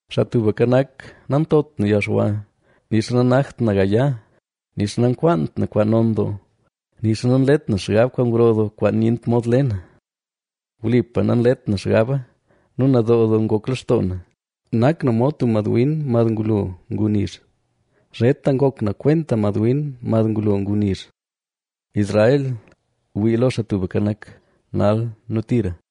Xaa Tubka Nak, nantot na yalxwa, nixa nanakt na gaya, nixa nankwaant na kwaan non doo, nixa nanlet na xgab kwaan gro doo kwaan nyent mod le na. Wlipa nanlet na xgaba nu nadoo doo ngok lextoo na, nak na mod tub madwin mad ngulo ngu nizh. Zheta ngok na kwenta madwin mad ngulo ngu nizh. Israel, wii lo Xaa Tubka Nak, nal nu tira.